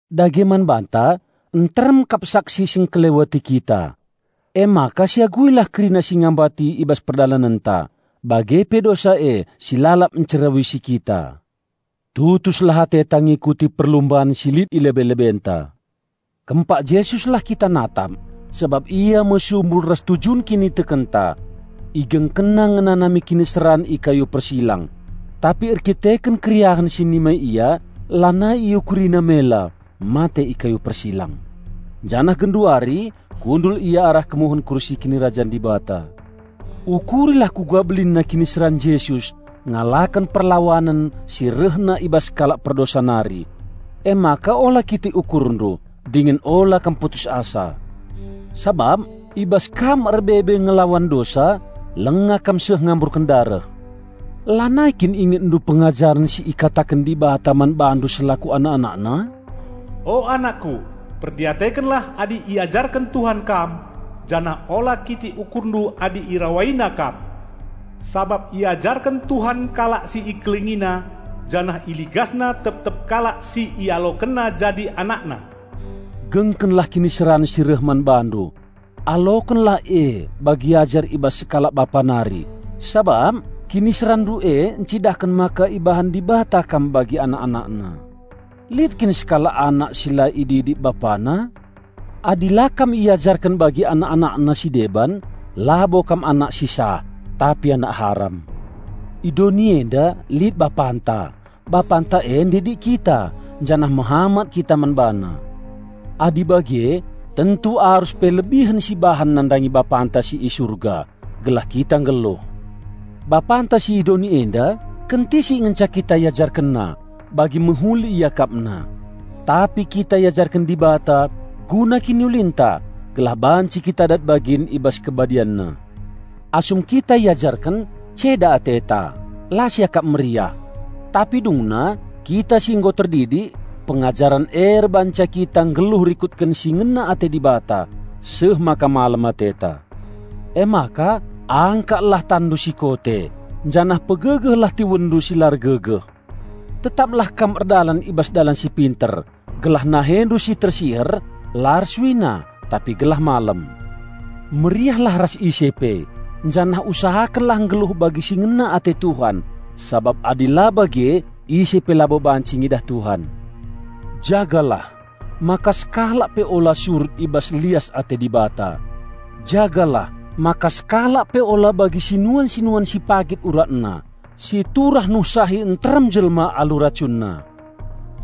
Dage man banta, nteremkap saksi si ngkeleweti kita. Emaka siaguilah kerina si ngambati i bas perdalanenta, bage pe dosa e si lalap ncerawisi kita. Tutuslah ateta ngikuti perlumban si lit i lebe-lebenta. Kempak Jesuslah kita natap, sabap ia me sumbul ras tujun kinitekenta. IgengkenNa ngenanami kiniseran i kayu persilang! Tapi erdandanken keriahen si nimai Ia, lanai IukuriNa mela mate i kayu persilang. Janah genduari kundul Ia arah kemuhen kursi kinirajan Dibata. Ukurilah uga belinna kiniseran Jesus ngalaken perlawanen si rehna i bas kalak perdosa nari. Emaka ula kitik ukurndu, dingen ula kam putus asa. Sabap i bas kam erbebe ngelawan dosa langa kam seh ngamburken dareh. Lanai kin ingetndu pengajaren si ikataken Dibata man bandu selaku anak-AnakNa? "O anakKu, perdiatekenlah adi iajarken Tuhan kam, janah ula kitik ukurndu adi IrawaiNa kam. Sabap iajarken Tuhan kalak si IkelengiNa, janah IligasNa tep-tep kalak si IalokenNa jadi AnakNa." Gengkenlah kiniseran si reh man bandu. Alokenlah e bagi ajar i bas sekalak bapa nari, sabap kiniseranndu e ncidahken maka ibahan Dibata kam bagi anak-AnakNa. Lit kin sekalak anak si la ididik bapana? Adi la kam iajarken bagi anak-AnakNa si deban, labo kam anak si sah, tapi anak haram. I doni enda lit bapanta. Bapanta e ndidik kita, janah mehamat kita man bana. Adi bage tentu arus pe lebihen sibahan nandangi Bapanta si i Surga, gelah kita nggeluh. Bapanta si i doni enda kentisik ngenca kita iajarkenna, bagi mehuli iakapna. Tapi kita iajarken Dibata guna kiniulinta, gelah banci kita dat bagin i bas KebadianNa. Asum kita iajarken, ceda ateta, la siakap meriah. Tapi dungna, kita si nggo terdidik, pengajaren e erbahanca kita nggeluh rikutken si ngena ate Dibata, seh maka malem ateta. Emaka angkatlah tanndu si kote, janah pegegehlah tiwenndu si la ergegeh! Tetaplah kam erdalan i bas dalan si pinter gelah nahendu si tersiher la ersuina, tapi gelah malem. Meriahlah ras ise pe, janah usahakenlah nggeluh bagi si ngena ate Tuhan, sabap adi la bage ise pe labo banci ngidah Tuhan. Jagalah maka sekalak pe ula surut i bas lias ate Dibata. Jagalah maka sekalak pe ula bagi sinuan-sinuan si pagit uratna, si turah nuhsahi nterem jelma alu racunna.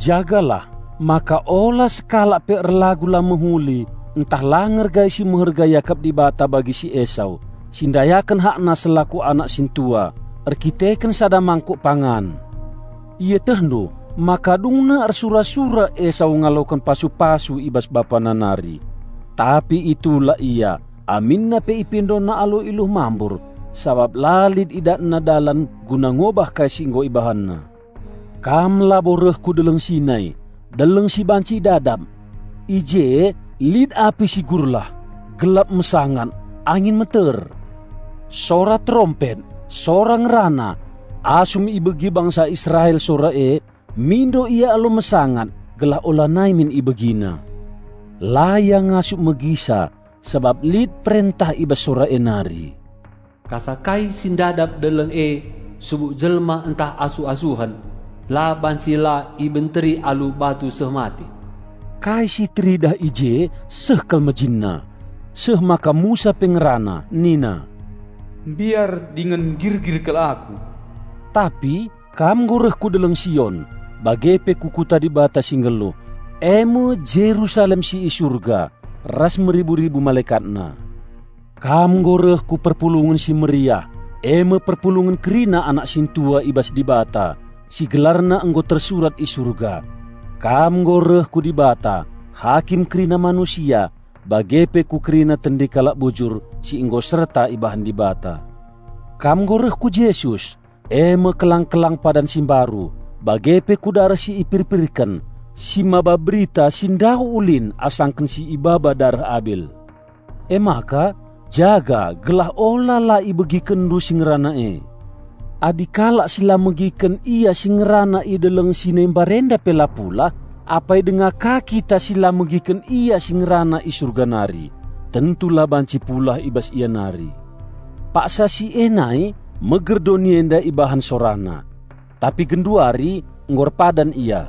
Jagalah maka ula sekalak pe erlagu la mehuli ntah la ngergai si meherga iakap Dibata bagi si Esau, si ndayaken hakna selaku anak sintua, erdandanken sada mangkuk pangan. Ietehndu maka dungna ersura-sura Esau ngaloken pasu-pasu i bas bapana nari; tapi itulak ia aminna pe ipindona alu iluh mambur, sabap la lit idatna dalan guna ngobah kai si nggo ibahanna. Kam labo reh ku Deleng Sinai, deleng si banci idadap; i je lit api si gurlah, gelap mesangat, angin meter; sora terompet, Sora Ngerana. Asum ibegi bangsa Israel sora e, mindo ia alu mesangat gelah ulanai min ibegina. La ia ngasup megisa sabap lit perentah i bas Sora e nari, "Kasa kai si ndadap deleng e, subuk jelma ntah asuh-asuhen, la banci la ibenteri alu batu seh mate." Kai si teridah i je seh kal mejinna, seh maka Musa pe ngerana nina, "Mbiar dingen ngirgir kal aku!" Tapi kam nggo reh ku Deleng Sion bage pe ku Kota Dibata si nggeluh, e me Jerusalem si i Surga ras meribu-ribu MalekatNa. Kam nggo reh ku perpulungen si meriah, e me perpulungen kerina anak sintua i bas Dibata, si gelarna nggo tersurat i Surga. Kam nggo reh ku Dibata, Hakim kerina manusia, bage pe ku kerina tendi kalak bujur si nggo serta ibahan Dibata. Kam nggo reh ku Jesus, e me kelang-kelang padan si mbaru, bage pe ku dareh si ipirpirken, si mbaba berita si ndauh ulin asangken si ibaba dareh Abil. Emaka jaga gelah ula la ibegikenndu Si Ngerana e. Adi kalak si la megiken Ia Si Ngerana i Deleng Sinai mbarenda pe la pulah, apai denga ka kita si la megiken Ia si ngerana i Surga nari, tentu la banci pulah i bas Ia nari! Paksa si e nai meger doni enda ibahan SoraNa. Tapi genduari nggo erpadan Ia,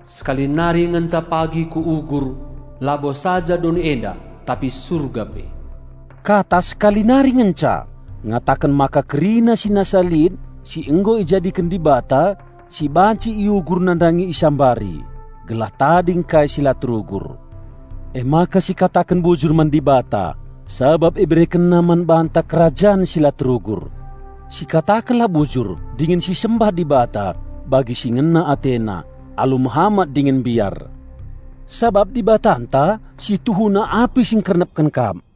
"Sekali nari ngenca pagi Kuugur, labo saja doni enda, tapi Surga pe." Kata "sekali nari ngenca" ngataken maka kerina si nasa lit si nggo ijadiken Dibata si banci iugur nandangi isambari, gelah tading kai si la terugur. Emaka sikataken bujur man Dibata, sabap IberekenNa man banta kerajan si la terugur. Sikatakenlah bujur dingen sisembah Dibata bagi si ngena AteNa, alu mehamat dingen mbiar; sabap Dibatanta situhuna api si ngkernepken kap.